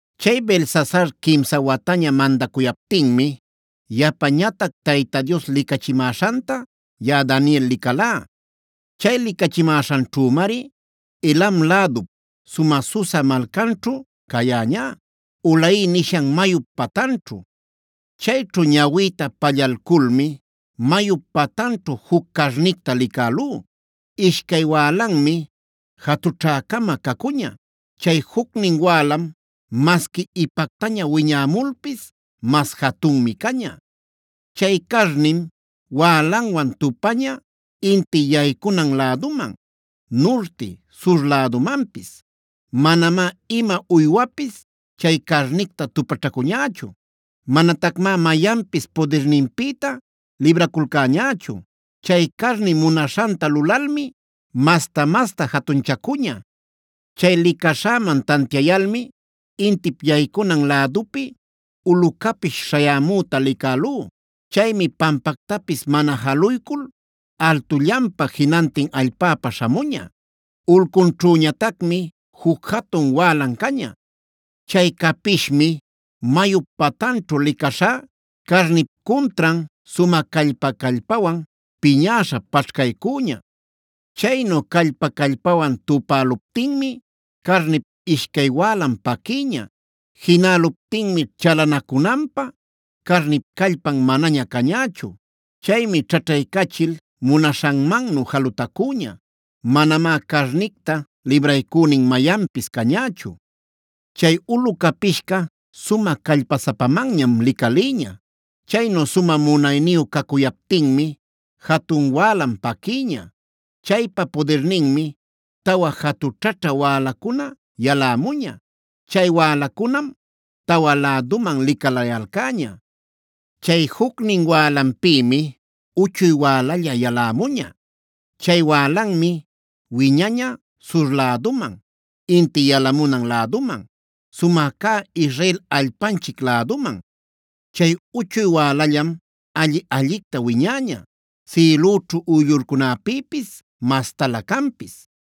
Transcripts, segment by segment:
Chay Belsasar quimsa wataña mandacuyaptinmi yapañatac Tayta Dios licachimäśhanta yaꞌa Daniel licalá. Chay licachimäśhanćhümari Elam lädup sumä Susa malcanćhu cayäñá, Ulai nishan mayup patanćhu. Chayćhu ñawïta pallalculmi mayup patanćhu juc carnicta licälú. Ishcay wälanmi jatućhä-cama cacuña. Chay jucnin wälan masqui ipactaña wiñämulpis mas jatunmi caña. Chay carnim wälanwan tupaña inti yaycunan läduman, nurti, sur lädumanpis. Manamá ima uywapis chay carnicta tupaćhacuñächu. Manatacmá mayanpis pudirninpïta libraculcäñächu. Chay carni munaśhanta lulalmi masta-masta jatunchacuña. Chay licaśhäman tantiayalmi intip yaycunan lädupi ulu capish śhayämüta licälú. Chaymi pampactapis mana jaluycul altullanpa jinantin allpäpa śhamuña. Ulcunćhüñatacmi juc jatun wälan caña. Chay capishmi mayup patanćhu licaśhá carnip cuntran sumä callpa-callpawan piñäśha paćhcaycüña. Chaynu callpa-callpawan tupäluptinmi carnip ishcay wälan paquïña. Jinäluptinmi chalanacunanpä carnip callpan manaña cañächu. Chaymi ćhaćhaycachil munaśhanmannu jalutacüña. Manamá carnicta libraycünin mayanpis cañächu. Chay ulu capishca sumä callpasapamanñam licalïña. Chaynu sumä munayniyu cacuyaptinmi jatun wälan paquïña. Chaypa pudirninmi tawa jatućhaćhä wälacuna yalämuña. Chay wälacunam tawan läduman licalayalcäña. Chay jucnin wälanpïmi uchuy wälalla yalämuña. Chay wälanmi wiñaña sur läduman, inti yalamunan läduman, sumä cä Israel allpanchic läduman. Chay uchuy wälallam alli-allicta wiñäña, sïlüćhu uyllurcunäpïpis mastalä canpis.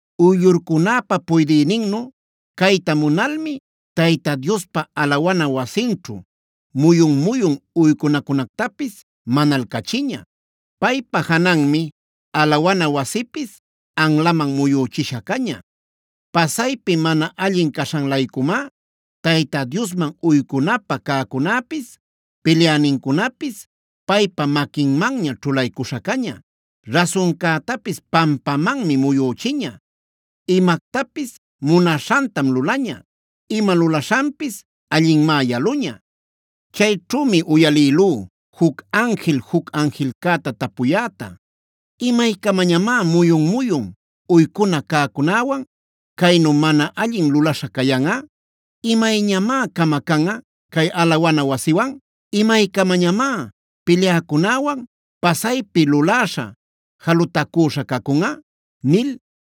Uyllurcunäpa puydïninnu cayta munalmi Tayta Diospa alawana wasinćhu muyun-muyun uycunacunactapis manalcachiña. Paypa jananmi alawana wasipis anlaman muyüchisha caña. Pasaypi mana allin caśhan-laycumá Tayta Diosman uycunapä cäcunäpis, pilyänincunapis paypa maquinmanña ćhulaycuśha caña. Rasuncätapis pampamanmi muyüchiña; imactapis munaśhantam lulaña. Ima lulaśhanpis allinmá yaluña. Chayćhümi uyalïlú juc anjil juc anjilcäta tapuyäta: “¿Imaycamañamá muyun-muyun uycuna cäcunäwan caynu mana allin lulaśha cayanꞌa? ¿Imayñamá camacanꞌa cay alawana wasiwan? ¿Imaycamañamá pilyäcunäwan, pasaypi luläśha, jalutacüśha cacunꞌa?” nil.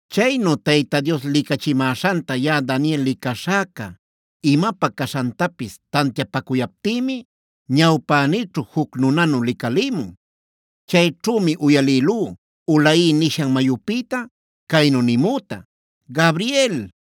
Chaynu Tayta Dios licachimäśhanta yaꞌa Daniel licaśhäca imapä caśhantapis tantiapacuyaptïmi ñawpänïćhu juc nunanu licalïmun. Chayćhümi uyalïlú Ulai nishan mayupïta caynu nimüta: “Gabriel,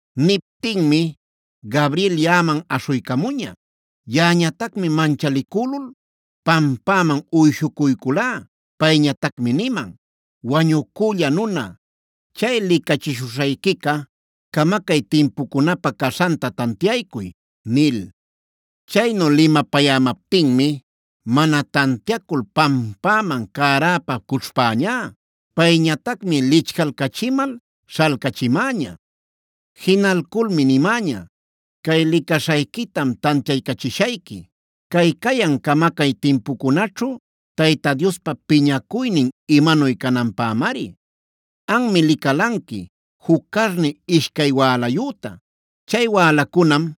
Niptinmi Gabriel yaꞌaman aśhuycamuña. Yaꞌañatacmi manchalicülul pampäman uyshucuyculá. Payñatacmi niman: “Wañucülla nuna, chay licachishuśhayquica camacay timpucunäpä caśhanta tantiaycuy” nil. Chaynu limapayämaptinmi mana tantiacul pampäman cäräpa cućhpäñá.c Payñatacmi lichcalcachimal śhalcachimäña. Jinalculmi nimäña: “Cay licaśhayquitam tantiaycachishayqui; cay cayan camacay timpucunaćhu Tayta Diospa piñacuynin imanuy cananpämari. Anmi licalanqui juc carni ishcay wälayüta. Chay wälacunam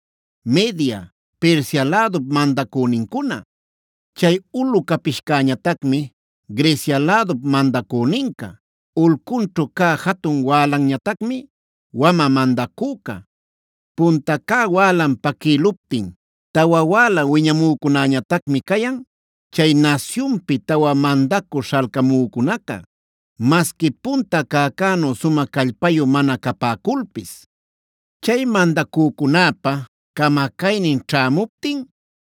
Media, Persia lädup mandacünincuna. Chay ulu capishcäñatacmi Grecia lädup mandacüninca. Ulcunćhu cä jatun wälanñatacmi wamä mandacüca. Punta cä wälan paquïluptin tawa wäla wiñamücunäñatacmi cayan, chay nasyunpi tawa mandacü śhalcamücunaca, masqui punta cäcänu sumä callpayu mana capäculpis. “Chay mandacücunäpa camacaynin ćhämuptin,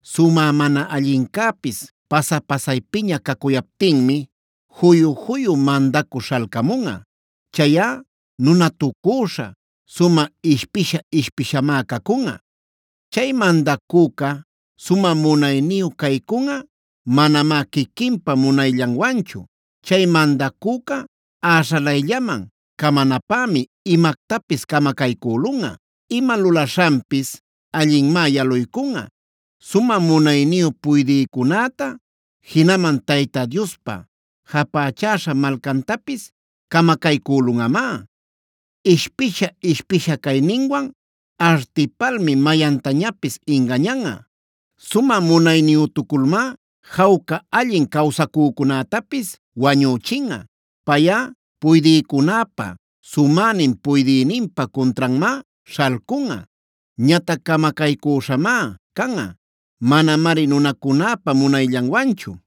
sumä mana allincäpis pasa-pasaypiña cacuyaptinmi juyu-juyu mandacü śhalcamunꞌa. Chayꞌa nunatucüśha, sumä ishpisha-ishpishamá cacunꞌa. Chay mandacüca sumä munayniyu caycunꞌa, manamá quiquinpa munayllanwanchu. Chay mandacüca äśhalayllaman camanapämi imactapis camacaycülunꞌa. Ima lulaśhanpis allinmá yaluycunꞌa. Sumä munayniyu puydïcunäta, jinaman Tayta Diospa japächäśha malcantapis camacaycülunꞌamá. Ishpisha-ishpisha cayninwan artipalmi mayantañapis ingañanꞌa. Sumä munayniyütuculmá jawca allin cawsacücunätapis wañüchinꞌa. Payꞌa puydïcunäpa sumänin Puydïninpa cuntranmá śhalcunꞌa. Ñatac camacaycüśhamá canꞌa, manamari nunacunäpa munayllanwanchu.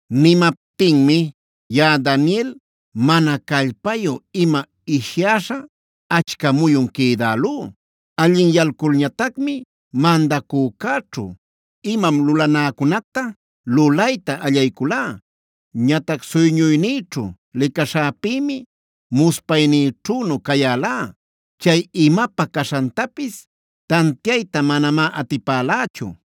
Nimaptinmi yaꞌa Daniel mana callpayü-ima ishyäśha achca muyun quïdälú. Allinyalculñatacmi mandacücäćhu imam lulanäcunacta lulayta allayculá. Ñatac suyñuynïćhu licaśhäpïmi muspaynïćhünu cayälá; chay imapä caśhantapis tantiayta manamá atipälächu.